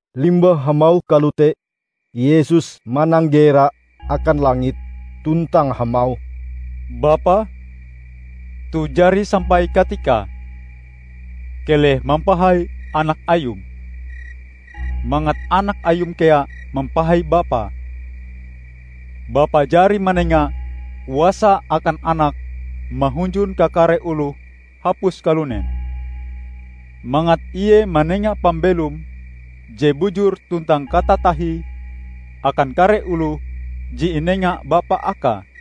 Limbah hamauh kalote, Yesus mananggera akan langit tuntang hamauh, "Bapa, toh jari sampai katikae. Keleh mampahai Anak Ayum, mangat Anak Ayum kea mampahai Bapa. Bapa jari manenga kuasa akan Anak mahunjun kakare oloh hapus kalunen, mangat Ie manenga pambelom je bujur tuntang katatahie akan kare oloh je inenga Bapa akae.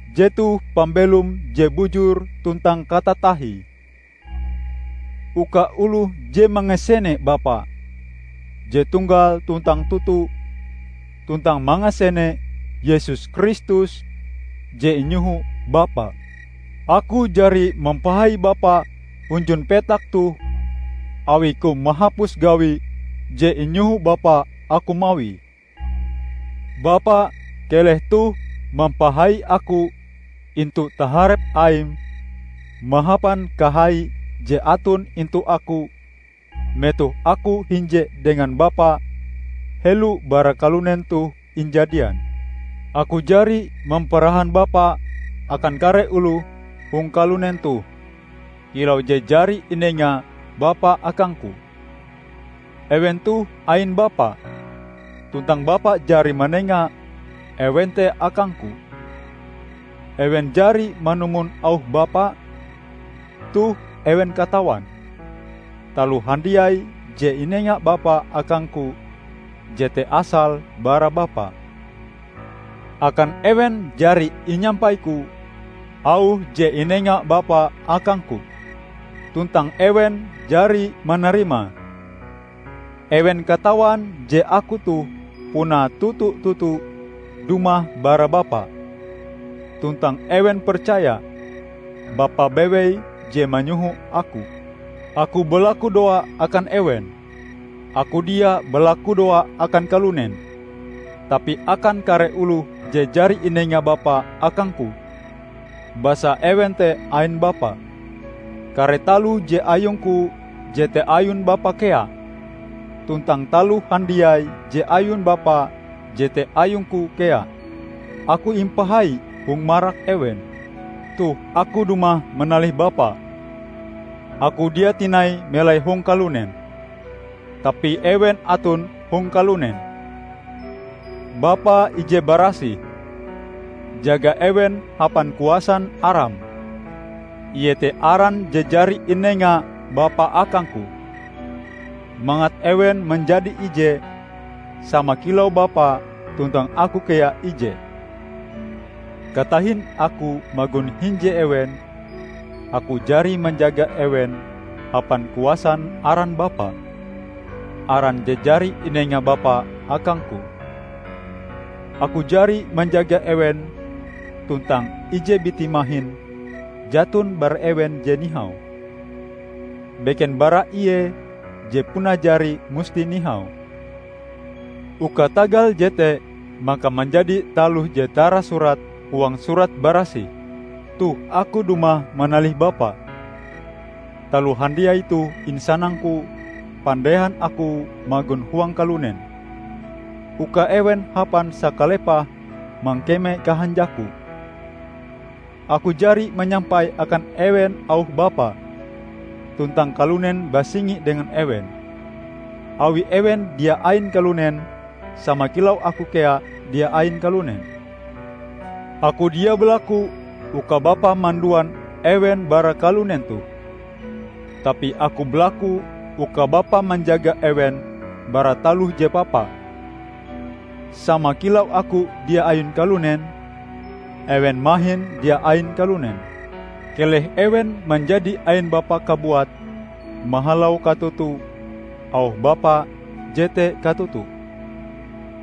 Jetoh pambelom je bujur tuntang katatahie; uka oloh je mangasene Bapa je tunggal tuntang toto, tuntang mangasene Yesus Kristus je inyoho Bapa. Aku jari mampahai Bapa hunjun petak toh awi-Ku mahapus gawi je inyoho Bapa Aku mawie. Bapa! keleh toh mampahai Aku intu taharep Aim mahapan kahai je aton intu Aku metoh Aku hinje dengan Bapa helo bara kalunen toh injadian. Aku jari mamparahan Bapa akan kare oloh hong kalunen toh kilau je jari inenga bapa akang-Ku. Ewen toh ain Bapa, tuntang Bapa jari manenga ewen te akang-Ku. Ewen jari manumon auh Bapa. Toh ewen katawan, taloh handiai je inenga Bapa akang-Ku jete asale bara Bapa. Akan ewen jari inyampai-Ku auh je inenga Bapa akang-Ku; tuntang ewen jari manarimae. Ewen katawan je Aku toh puna toto-toto dumah bara Bapa tuntang ewen percaya Bapa bewei je manyoho Aku. Aku balakudoa akan ewen. Aku dia balakudoa akan kalunen tapi akan kare oloh je jari inenga Bapa akang-Ku, basa ewen te ain Bapa. Kare taloh je ayung-Ku jete ayun Bapa kea; tuntang taloh handiai je ayun Bapa jete ayung-Ku kea. Aku impahai hong marak ewen. Toh Aku dumah manalih Bapa. Aku dia tinai melai hong kalunen; tapi ewen aton hong kalunen. Bapa ije barasih! Jaga ewen hapan kuasan Aram, iete Aran je jari inenga Bapa akang-Ku -- mangat ewen manjadi ije, sama kilau Bapa tuntang Aku kea ije. Katahin Aku magon hinje ewen, Aku jari manjaga ewen hapan kuasan aran Bapa -- aran je jari inenga Bapa akang-Ku. Aku jari manjaga ewen tuntang ije biti mahin jaton bara ewen je nihau, beken bara ie je puna jari musti nihau; uka tagal jete maka manjadi taloh je tarasurat huang Surat Barasih. Toh Aku dumah manalih Bapa. Taloh handiai toh insanang-Ku pandehan Aku magon huang kalunen; uka ewen hapan sakalepahe mangkeme kahanjak-Ku. Aku jari manyampai akan ewen auh Bapa, tuntang kalunen basingi dengan ewen, awi ewen dia ain kalunen, sama kilau Aku kea dia ain kalunen. Aku dia balaku uka Bapa manduan ewen bara kalunen toh, tapi Aku balaku uka Bapa manjaga ewen bara taloh je papa. Sama kilau Aku dia ain kalunen, ewen mahin dia ain kalunen. Keleh ewen manjadi ain Bapa kabuat mahalau katoto: auh Bapa jete katoto.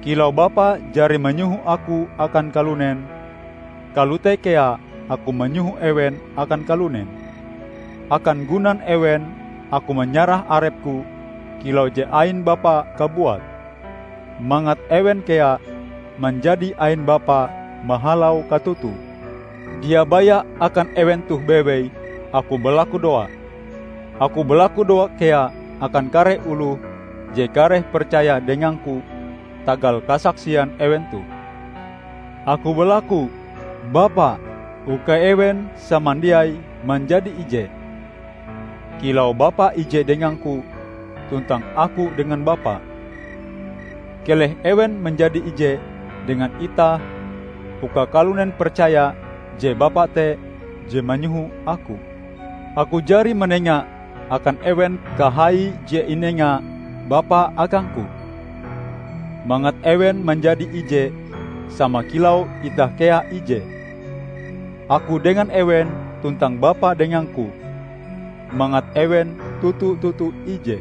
Kilau Bapa jari manyoho Aku akan kalunen, kalote kea Aku manyoho ewen akan kalunen. Akan gunan ewen, Aku manyarah arep-Ku kilau je ain Bapa kabuat, mangat ewen kea manjadi ain Bapa mahalau katoto. Dia baya akan ewen toh bewei Aku balakudoa. Aku balakudoa kea akan kare oloh je kareh percaya dengang-Ku tagal kasaksian ewen toh. Aku balaku, Bapa, uka ewen samandiai manjadi ije, kilau Bapa ije dengang-Ku, tuntang Aku dengan Bapa. Keleh ewen manjadi ije dengan itah uka kalunen percaya je Bapa te je manyoho Aku. Aku jari manenga akan ewen kahai je inenga Bapa akang-Ku, mangat ewen manjadi ije, sama kilau itah kea ije; Aku dengan ewen, tuntang Bapa dengang-Ku; mangat ewen toto-toto ije.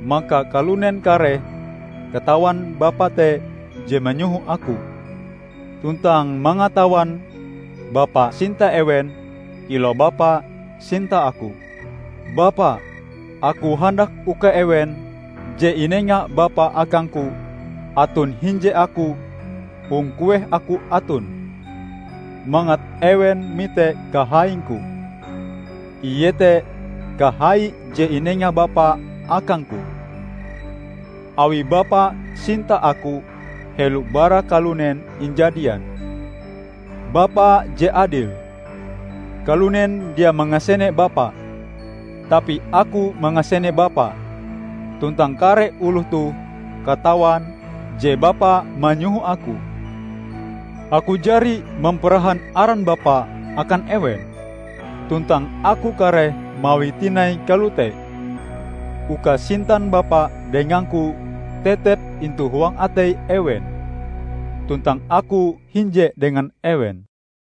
Maka kalunen kareh katawan Bapa te je manyoho Aku, tuntang mangatawan Bapa sinta ewen kilau Bapa sinta Aku. Bapa, Aku handak uka ewen, je inenga Bapa akang-Ku, aton hinje Aku hong kueh Aku aton, mangat ewen mite kahaing-Ku; iete kahai je inenga Bapa akang-Ku, awi Bapa sinta Aku helo bara kalunen injadian. Bapa je adil! Kalunen dia mangasene Bapa, tapi Aku mangasene Bapa; tuntang kare oloh toh katawan je Bapa manyoho Aku. Aku jari mamparahan aran Bapa akan ewen; tuntang Aku kareh mawie tinai kalote, uka sintan Bapa dengang-Ku tetep intu huang atei ewen tuntang Aku hinje dengan ewen."